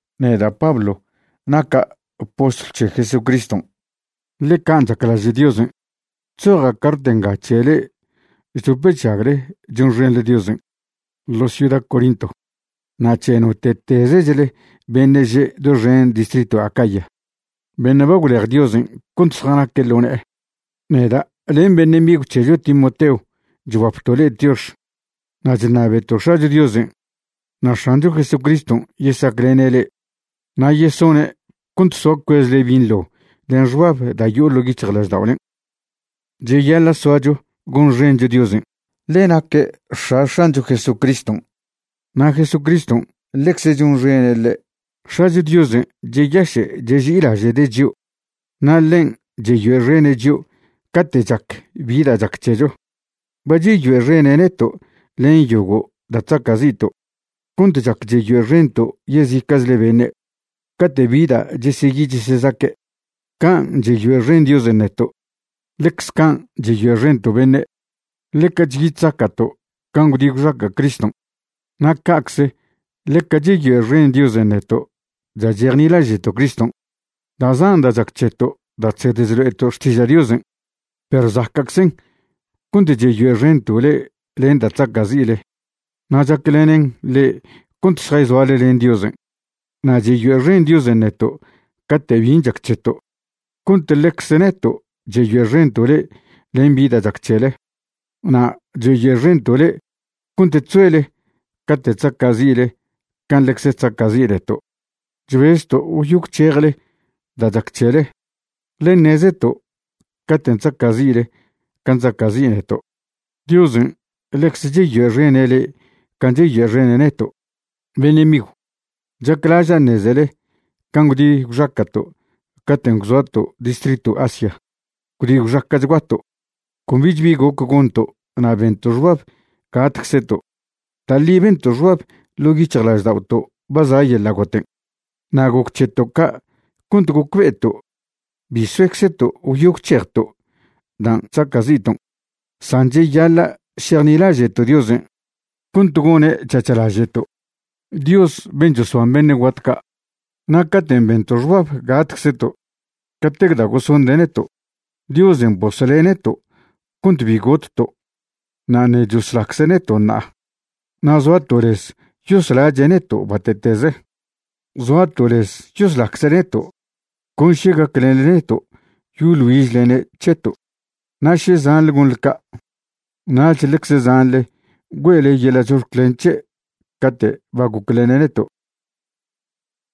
Neda' Pablo naca' postlw c̱he Jesucriston', ḻe can' chaclaže' Diosen'. Chzoja' cart nga c̱he le'e chdop chžagle chonxenḻe Diosen' ḻo ciuda Corinto, na' c̱he note'tezechle beṉe' že' doxen distritw Acaya beṉe' ba gwlej Diosen' cont zjanaque' ḻo ne'e. Neda' len beṉe' migw c̱hecho Timoteo chguapto' le'e tiox. Na' chṉabeto' X̱acho Diosen' na' X̱ancho Jesucriston' yesaclene' le'e na' yesone' cont soa cuezle binḻo len xbab da' yo'o ḻo' yic̱hjlažda'olen'. Cheyaḻa' soacho gonxencho Diosen', ḻe naque' X̱a X̱ancho Jesucriston', na' Jesucriston' ḻecze chonxene' ḻe'. X̱acho Diosen' cheyaše' cheži'ilaže'de' chio' na' ḻen' cheyoe'xene' chio' cate' chac bi da' chac c̱hecho. Ba cheyoe'xene' neto' len yogo' da' chzaca'zi'to' cont chac cheyoe'xento' yezica'chle beṉe' cate' bi da' cheseyi chesezaque'. Can' cheyoe'xen Diosen' neto', ḻecze can' cheyoe'xento' beṉe'. Ḻeca chyi chzaca'to' can' gwdi gwxaca' Criston', na' ca'cze ḻeca cheyoe'xen Diosen' neto' da' chejnilaže'to' Criston'. Da' zan da' chac c̱heto' da' chsed chlo'eto' xtiža' Diosen', perw zaca'czen' cont cheyoe'xento' le'e len da' chzaca'zi'le na' chaclenen le'e cont šjayzoale len Diosen'. Na' cheyoe'xen Diosen' neto' cate' bin' chac c̱heto', cont ḻecze neto' cheyoe'xento' le'e len bi da' chac c̱hele. Na' cheyoe'xento' le'e cont chzoele cate' chzaca'zi'le can' ḻecze chzaca'zi' neto'. Chbezto' gwyo gwc̱hejle da' chac c̱hele, ḻe ṉezeto' caten' chzaca'zi'le can' chzaca'zi' neto', Diosen' ḻecze cheyoe'xene' le'e can' cheyoe'xene' neto'. Beṉe' migw, chaclaža' ṉezele can' gwdi gwxaca'to' caten' gwzoato' distritw Asia. Gwdi gwxaca'chguato', con bich bi goc gonto' na' bento' xbab gatczeto'. Da' ḻi bento' xbab ḻo' yic̱hjlažda'oto' ba za' yeḻa' goten'. Na' goc c̱heto' ca' cont gocbe'eto' bi soeczeto' gwyo gwc̱hejto' dan' chzaca'zi'ton' san cheyaḻa' šejnilaže'to' Diosen' cont gone' c̱hac̱h laže'to', Dios ben' chosban beṉe' guat ca'. Na' caten' bento' xbab gatczeto' catec da' gosonde' neto', Diosen' bosle' neto' cont bi gotto' na' ṉe' choslacze' neto' ṉa'a. Na' zoato' lez yoslache' neto' bate'teze. Zoato' lez yoslacze' neto' con še gaclenḻe neto' yoḻ güižlene' c̱heto'. Na' še zanḻe gonḻe ca', nach ḻecze zanḻe güe'le yeḻa' chox̱clen c̱he' cate' ba goclene' neto'.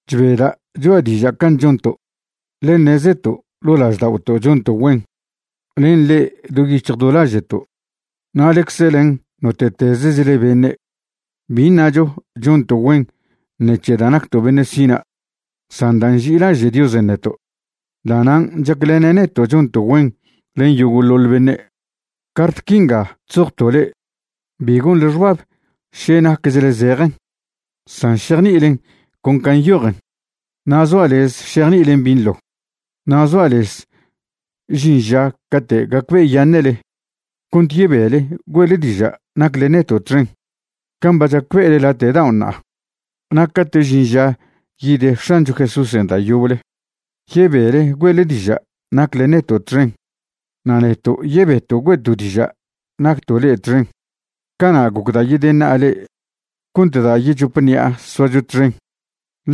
Chbeda' choa' diža' can' chonto', ḻe ṉezeto' ḻo' lažda'oto' chonto' güen len le'e do yic̱hj do laže'to' na' ḻecze len note'tezechle beṉe'. Bi ṉacho chonto' güen ṉec̱he da' nacto' beṉe' sina', san da' nži'ilaže' Diosen' neto', da'nan' chaclene' neto' chonto' güen len yogo'ḻoḻ beṉe'. Cart quinga chzojto' le'e, bi gonḻe xbab še naquechle zejen, san šejni'ilen con can' nyojen, na' zoa' lez šejni'ilen binḻo. Na' zoa' lez žin ža cate' gacbe'eyaṉe'le cont yebele güe'le diža' nacle neto' txen, can' ba chacbe'ele late' dao' ṉa'a. Na' cate' žin ža yid X̱ancho Jesúsen' da' yoble, yebele güe'le diža' nacle neto' txen na' neto' yebeto' güe'to' diža' nacto' le'e txen. Cana' gocda' yedeṉa'a le'e cont da' yechop ṉi'a soacho txen,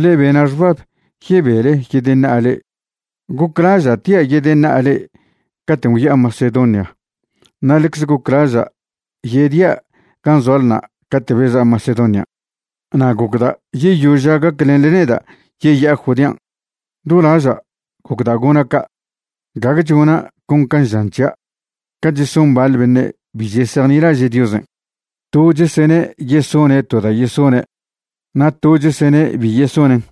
ḻe bena' xbab yebele yedeṉa'a le'e. Goclaža' tia' yedeṉa'a le'e caten' gwya'a Macedonia na' ḻecze goclaža' yedia' gan' zoalna' cate' beza' Macedonian'. Na' gocda' yeyoža' gaclenḻe neda' yeya'a Judean'. Do laža' gocda' gona' ca', gague chona' con can' žan c̱hia' ca cheson baḻ beṉe' bi chesejnilaže' Diosen', to chesene' yesone' to da' yesone' na' to chesene' bi yesonen'.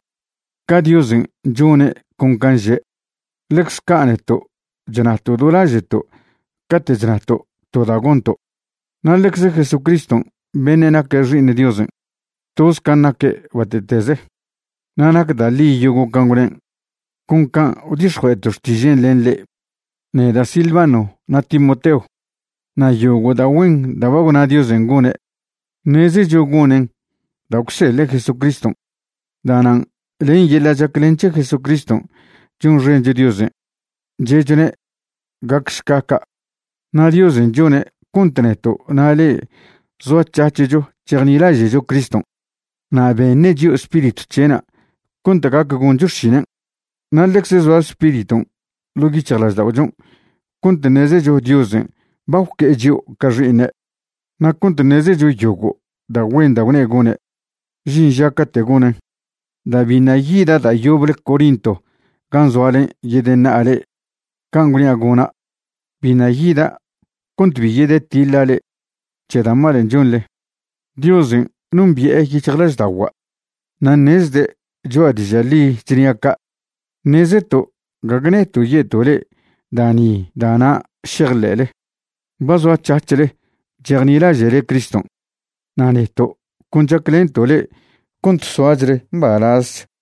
Ca Diosen' chone' con can' že', ḻecze ca' neto' chnato' do laže'to' cate' chnato' to da' gonto'. Na' ḻecze Jesucriston' beṉe' naque' Xi'iṉ Diosen', toz can' naque' bate'teze, na' nac da' ḻi yogo' can' gwnen', con can' gwdix̱jue'eto' xtižen' len le'e, neda', Silvano na' Timoteo. Na' yogo' da' güen da' ba gwna Diosen' gone', ṉezecho gonen' da' gwseḻe' Jesucriston'. Da'nan' len yeḻa' chaclen c̱he Jesucriston' chonxencho Diosen' che'chone': “Gacšca ca'.” Na' Diosen' chone' cont neto' na' le'e zoac̱hac̱hcho chejnilaže'cho Criston'. Na' beṉe' chio' Spiritw c̱he'na' cont gac goncho xšinen'. Na' ḻecze zoa Spiriton' ḻo' yic̱hjlažda'ochon' cont ṉezecho Diosen' ba gwque'e chio' ca xi'iṉe' na' cont ṉezecho yogo' da' güen da' gwne' gone', žin ža cate' gonen'. Da' biṉa' yida' da' yoble Corinto gan' zoalen' yedeṉa'a le'e can' gwnia' gona', biṉa' yida' cont bi yedetiḻa' le'e c̱he da' malen' chonḻe. Diosen' nombi'e yic̱hjlažda'ogua' na' ṉezde' choa' diža' ḻi chnia' ca'. Ṉezeto' gague neto' ye'to' le'e da' ni da' na' šejḻe'le. Ba zoac̱hac̱hle chejnilaže'le Criston', na' neto' con chaclento' le'e cont soachle mbalazch.